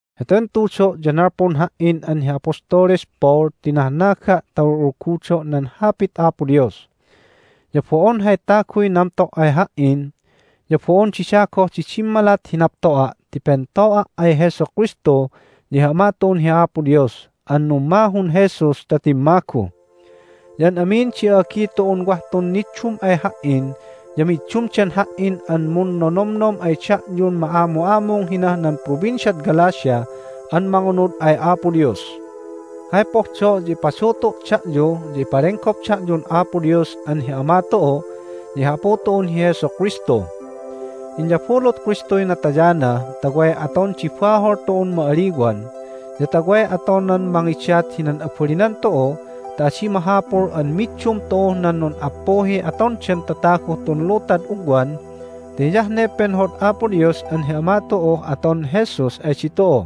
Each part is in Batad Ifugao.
Heten tudo' ya nalpun ha"in an hi Apostoles Paul ti nahnaga' ta ul'ulgudo' nan Hapit Apo Dios. Ya bo'on hay taguy namto' ay ha"in, ya bo'on dida goh di dimmalat hi napto'a' ti pento'a' ay Jesu Kristu ya hi Ama tu'un hi Apo Dios an nummahun Jesus ta timmagu. Ya an amin di a'agi tu'un wah tun niddum ay ha"in ya middumdan ha"in an munnonomnom ay da'yun ma'amu'amung hinah nan Provinciad Galatia an mangunud ay Apo Dios. Hay pohdo' ya ipadutu' da'yu ya ipalenggop da'yun Apo Dios an hi Ama tu'u ya hi Apu tu'un hi Jesu Kristu. Inyabulut Kristuy natayana ta way aton di bahol tu'un ma'aliwan, ya ta way atonan mangidat hinan abalinan tu'u ta adi mahapul an middum tu'uh nan nun'appuhiy atondan tataguh tun lutad ugwan, ti hiyah ne penhod Apo Dios an hi Ama tu'uh aton Jesus ay ditu'u.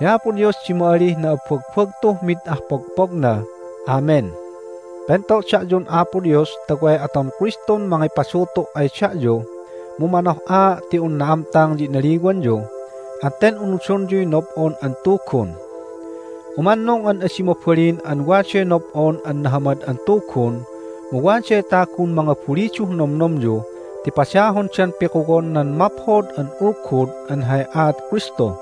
Hi Apo Dios di ma'alih na'abbagbagtuh mid ah pogpogna! Amen. Pento' da'yun Apo Dios ta way aton Kristun mangipadutu' ay da'yu, mu manoh'aa' ti un na'amtang ya inaliwanyu, at ten unudonyuy nob'on an tugun. Umannung an adi mabalin an waday nob'on an Nahamad an Tugun, mu waday tagun mangabuliduh nomnomyu ti padahondan pikuwon nan Maphod an Ulgud an hay aat Kristu.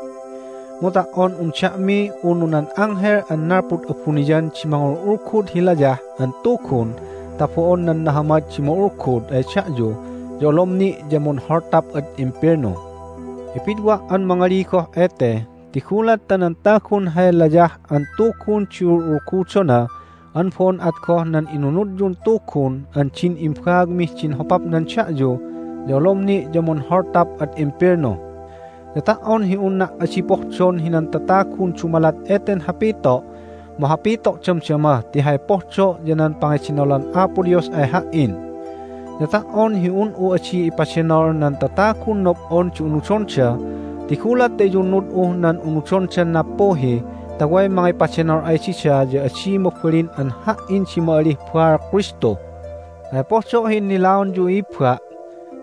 Mu ta"on un da'mi unu nan anghel an nalpud abuniyan di mangul'ulgud hi layah an tugun ta bo'on nan nahamad di ma'ulgud ay da'yu ya olom ni' ya munholtap ad imbelnu. Ipidwa' an mangali goh ete, ti gulat ta nan tagun hay layah an tugun di ul'ulgudona an bo'on at goh nan inunudyun Tugun an din imbaagmih din hopapnan da'yu ya olom ni' ya munholtap ad imbelnu. Ya ta"on hi unna' adi pohdon hinan tatagun dumalat eten hapito' mu hapito' damdama ti hay pohdo' ya nan pangedenolan Apo Dios ay ha"in. Ya ta"on hi un'u adi ipadenol nan tatagun nob'on di unudonda, ti gulat ta iyunnud'uh nan unudondan nappuhi ta way mangipadenol ay dida ya adi mabalin an ha"in di ma'alih baal Kristu. Hay pohdo' hi innilaonyu, i'ibba',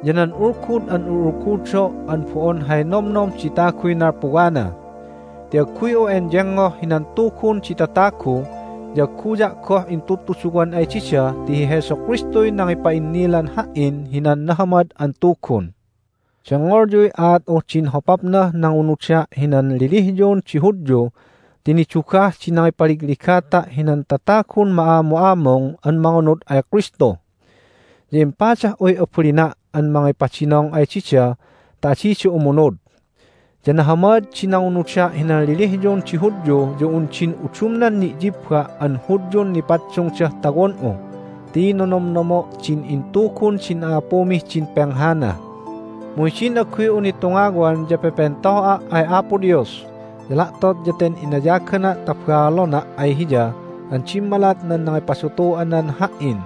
ya nan ulgud an ul'ulgudo' an bo'on hay nomnom di taguy nalpuwana. Ti agguy'u enyengngoh hinan tugun di tatagu, ya agguya' goh intudtuduwan ay dida ti hi Jesu Kristuy nangipa'innilan ha"in hinan Nahamad an Tugun. Dengngolyuy aat'uh din hopapnah nangunuda' hinan lelehyon di Hudyu ti nidugah di nangipaligligata' hinan tatagun ma'amu'amung an mangunud ay Kristu. Ya impadah'uy abalina' an mangipadinong ay dida ta adida umunud. Ya nahamad di nangunuda' hinan lelehyon di Hudyu ya un din udumnan ni'yibba' an Hudyun nipaddungdah tawon'u, ti nonomnomo' din intugun din a'apumih din penghana. Mu hidin agguy'u nitungawan ya pepento'a' ay Apo Dios, ya la'tot ya ten inayagana' ta baalona' ay Hiya an dimmalat nan nangipadutu'anan ha"in.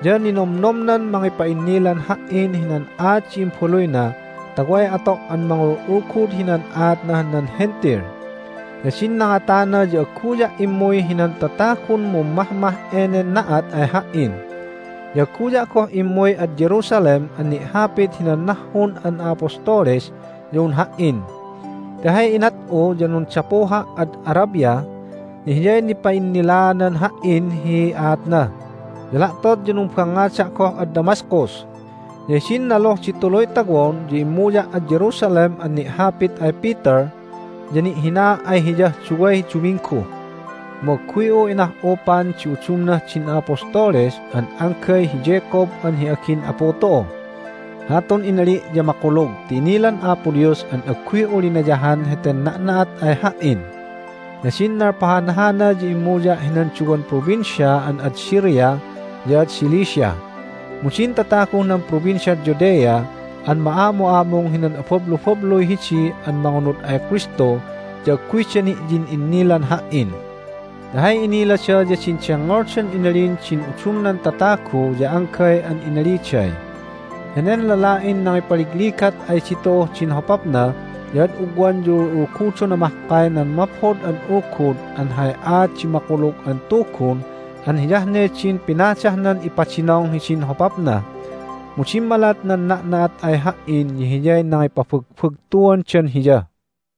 Ya ninomnomnan mangipa'innilan ha"in hinan aat di Imbaluyna ta way ato' an mangul'ulgud hinan aatnah nan Hentil. Ya din nangatana ya agguya' immuy hinan tatagun mummahmah enen na'at ay ha"in, ya agguya' goh immuy ad Jerusalem an ni'hapit hinan nahhun an a'apostoles ya un ha"in. Ti hay inat'u ya nundapuha' ad Arabia, ya Hiyay nipa'innilaanan ha"in hi aatna, ya la'tot ya numbangngada' goh ad Damascus. Ya hidin naluh di tuluy tawon ya immuya' ad Jerusalem an ni'hapit ay Peter, ya ni'hinaa' ay hiyah duway duminggu. Mu agguy'u inah'upan di udumnah din a'apostoles, an anggay hi Jacob an hi agin Apu tu'u. Hatun inali' ya makulug ti inilan Apo Dios an agguy'u linayahan heten na'na'at ay ha"in. Ya din nalpahan hana ya immuya' hinan duwan provincia an ad Syria ya ad Cilicia. Mu din tataguh nan Provinciad Judea an ma'amu'amung hinan abablubabluy hidi an mangunud ay Kristu ya agguyda ni'yin'innilan ha"in. Ti hay inilada ya din dengngoldan inalin din udumnan tatagu ya anggay an inaliday, "Henen lala'in nangipaligligat ay ditu'uh din hopapna ya ad ugwan ya ul'ulgudona mahkay nan Maphod an Ulgud an hay aat di Makulug an Tugun an hiyah din pinadahnan ipadinong hidin hopapna!" Mu dimmalat nan na'na'at ay ha"in ya hiyay nangipabagbagtuandan Hiya.